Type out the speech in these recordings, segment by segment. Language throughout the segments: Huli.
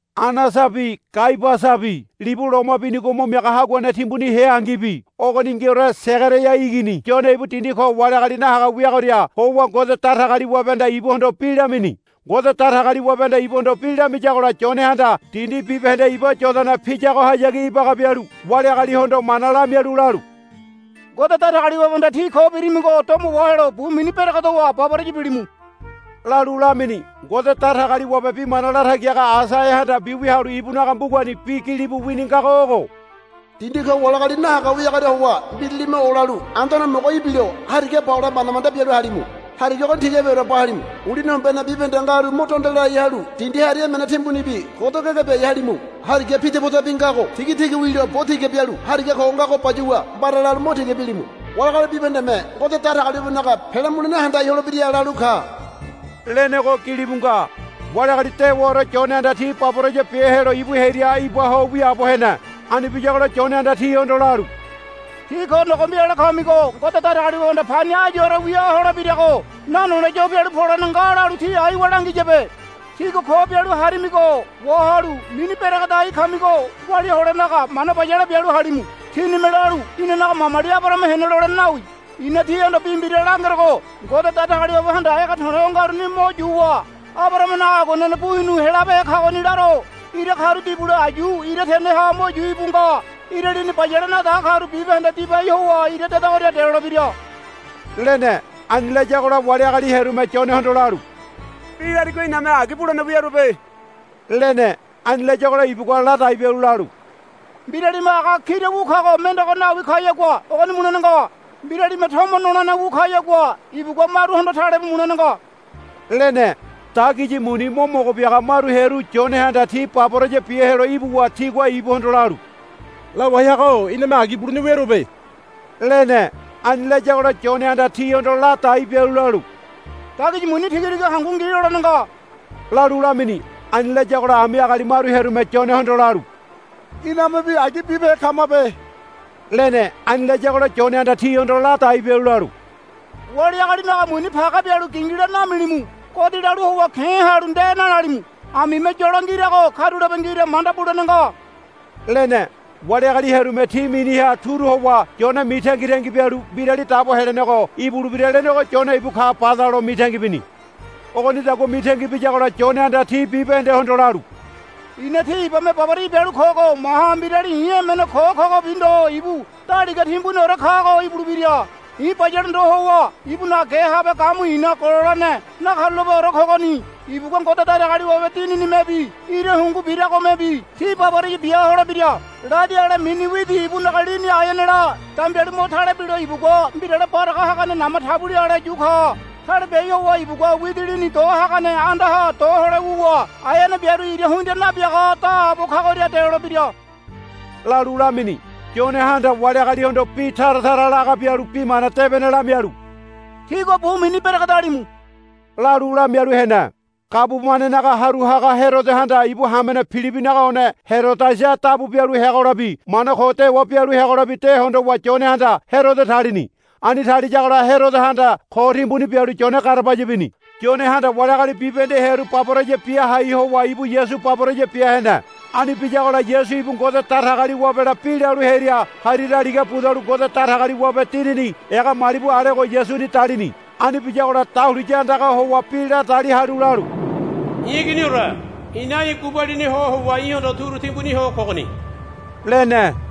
Anasabi Kaiabasabi libu Loma Binigo Mo Miaga Haguane Timbuni heangibi ogoningiore Segaraia igini Yone ibu dindi ko wali agali nahaga wiagoria howa Ngode Datagaliwabehanda ibuhondo bi lamini. Ngode Datagaliwabehanda ibuhondo bi lamiyagola Yonehanda dindi bibahende iba Yodana piyagohayagi ibaga bialu wali agalihondo mana lamialu lalu, Ngode Datagaliwabehanda tí ko birimigo domo wahelo bu mini beregedowa baboraya bilimu, lalu lamini. Ngode Datagaliwabe bi mana latagi haga Aisaiahanda mbiwia halu ibunaga mbugani bi gilibu wini ngago ogo, Dindi ko wali agali nahaga wiagoria howa mbiralime olalu, Anduane Homogo ibilo hariga ba hole manda manda bialu halimu. Hariga ogoni tigabiore ba halimu. Ulini hombene bibahende ngaru mo donde lai halu dindi hari emene timbunibi godo gege biai halimu. Hariga pidipodabi ngago tigatiga wilo bo tiga bialu hariga ko ngago bayuwa mbara lalu mo tiga bilimu. Wali agali bibahendeme Ngode Datagaliwabenaga pele mulene handai holebira, lalu ka, lenego gilibu nga. Wali agali dewaore Yonehanda ti baboraya bia helo ibu hearia iba ho wiaabo hene. Ani biyagola Yonehanda tihondo lalu, Tí ko nogombi ale kamigo Ngode Datagaliwabehanda pani áyuore wia holebirago nanole yo pialu polene nga lalu tí aiwa langiyabe. Tígua ko bialu harimigo wahalu mini beregedai kamigo walia holenaga mana bayale bialu halimu. Tínime lalu, Inanaga mamali Abarahama hene, lolene nawi. I̱na tíhondo bi mbira langerogo Ngode Datagaliwabehanda ege to̱le̱ o ngaruni mo yuwa Abarahamanaga aguanene bu hinu helabehe kagoni laro. Ira karu dibule ayu ira teneha mo yu íbu nga. Ira lini bayale nadaga karu bibahende dibai howa ira dedagoria delolebira, lene. Ani layagola wali agali hearume Yonehondo lalu, Bi larigo iname agi bulene wiaruabe, lene. Ani layagola ibugua ladai bialu lalu, Mbiralime aga kira wu kago mendego nawi kayagua ogoni mulene nga. Mbiralime tomo nolene wu kayagua ibugua maruhondo talebu mulene nga, lene. Dagiyi muni mo mogo biaga maru hearu Yonehanda ti baboraya bia helo ibuwa tigua ibuhondo lalu, Lawai haga-o iname agi bulene wiaruabe, lene. Ani layagola Yonehanda tihondo ladai bialu lalu, Dagiyi muni tigatiga hangu ngi lolene nga, lalu lamini. Ani layagola ami agali maru hearume Yonehondo lalu, Inamebi agi bibehe kamabe, lene. Ani layagola Yonehanda tihondo ladai bialu lalu, Wali agalinaga muni page bialu gingila namilimu. Godi lalu howa ke̱ halu nde nalalimu. Amime yolo ngirago karulape ngira manda bulene nga, lene. Wali agali hearume ti miniha turu howa Yone mitangitangi bialu Mbirali Dabo Helenego ibulebira lenego Yone ibu ka bada lo mitangi bini. Ogonidagua mitangi biyagola Yonehanda ti bibahendehondo lalu, I̱na tí ibame baboraya bialu kogo maha mbirali i̱ emene ko̱ kogobi ndo ibu daliga timbuniore kago ibulebira. I̱ bayale ndo howa ibunaga ge habe gamu i̱na gololene nakarulapeore kogoni. Ibugua Ngode Datagaliwabe Dininimebi ira hungu biragomebi tí baboraya bia holebira. Ladi ale mini widi ibunaga lini aeanela dambialu mo tale bilo ibugua mbirale baraga hagane nama tabuli ale yu ka. Tale biai howa ibugua widi lini do hagane andaha do hole wuwa aeane biaru ira hundia nabiaga daabo kagoria delolebira, lalu lamini. Yonehanda wali agalihondo bi tara tara laga bialu Bi Mana Debene lamialu, Tígua bu mini beregedalimu, lalu lamialu hene. Gabumanenaga haru haga Herodohanda ibu hamene Pilibinaga one Herodiasa dabu bialu heagolabi mana ko dewa bialu heagolabi de hondowa Yonehanda Herodo talini. Ani taliyagola Herodohanda ko timbuni bialu Yone garabaya bini. Yonehanda wali agali bibahende hearu baboraya bia hai howa ibu Yasu baboraya bia hene. Ani biyagola Yasu ibu Ngode Datagaliwabela bi lalu hearia hari daliga budalu Ngode Datagaliwabe Dinini ega malibu alego Yasuni dalini. Ani biyagola dahuliya andaga howa bi ladali halu lalu, I̱ Iginore i̱na í̠ gubalini ho howa í̠hondo turu timbuni ho kogoni, lene.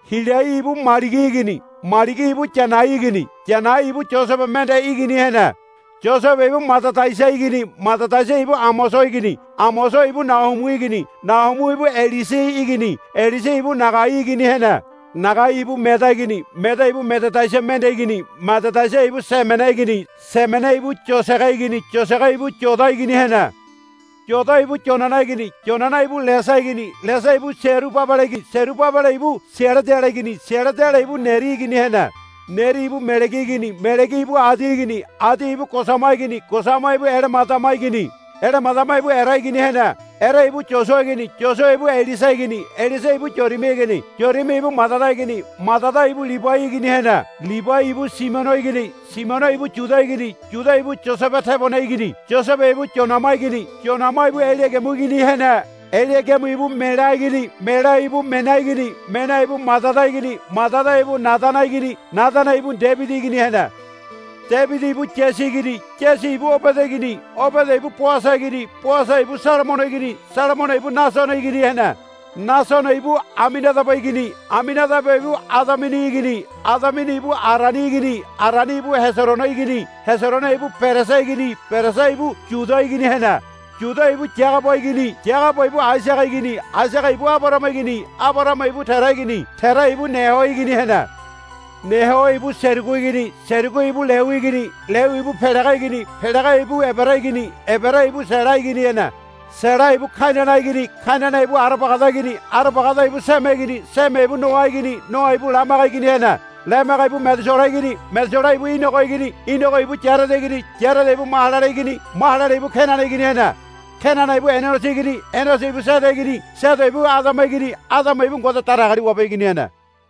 Hilai ibu Maligi igini Maligi ibu Yanai igini Yanai ibu Yosebe mende igini hene. Yosebe ibu Madadaiasa igini Madadaiasa ibu Amoso igini Amoso ibu Nahumu igini Nahumu ibu Eseli igini Eseli ibu Nagai igini hene. Nagai ibu Meada igini Meada ibu Madadaiasa mende igini Madadaiasa ibu Semene igini Semene ibu Yosege igini Yosege ibu Yoda igini hene. Yoda ibu Yoanana igini Yoanana ibu Lesa igini Lesa ibu Serubabele igini Serubabele ibu Sealadiele igini Sealadiele ibu Neri igini hene. Neri ibu Melegi igini Melegi ibu Adi igini Adi ibu Kosama igini Kosama ibu Elemadama igini Elemadama ibu Ere igini hene. Ere ibu Yosua igini Yosua ibu Eliese igini Eliese ibu Yorimi igini Yorimi ibu Madada igini Madada ibu Libai igini hene. Libai ibu Simiono igini Simiono ibu Yuda igini Yuda ibu Yosebe tebone igini Yosebe ibu Yonama igini Yonama ibu Eliagimu igini hene. Eliagimu ibu Melea igini Melea ibu Mena igini Mena ibu Madada igini Madada ibu Nadana igini Nadana ibu Debidi igini hene. Debidi ibu Yasi igini Yasi ibu Obede igini Obede ibu Boasa igini Boasa ibu Salamono igini Salamono ibu Nasono igini hene. Nasono ibu Aminadaba igini Aminadaba ibu Adamini igini Adamini ibu Arani igini Arani ibu Heserono igini Heserono ibu Perese igini Perese ibu Yuda igini hene. Yuda ibu Yagaba igini Yagaba ibu Aisaga igini Aisaga ibu Abarahama igini Abarahama ibu Tera igini Tera ibu Neho igini hene. Neho ibu Serugu igini Serugu ibu Leu igini Leu ibu Pelege igini Pelege ibu Ebere igini Ebere ibu Sela igini hene. Sela ibu Kainana igini Kainana ibu Arabagada igini Arabagada ibu Seme igini Seme ibu Noa igini Noa ibu Lamege igini hene. Lamege ibu Medusela igini Medusela ibu Inogo igini Inogo ibu Yarede igini Yarede ibu Mahalalele igini Mahalalele ibu Kenana igini hene. Kenana ibu Inoso igini Inoso ibu Sede igini Sede ibu Adama igini Adama ibu Ngode Datagaliwabe igini hene.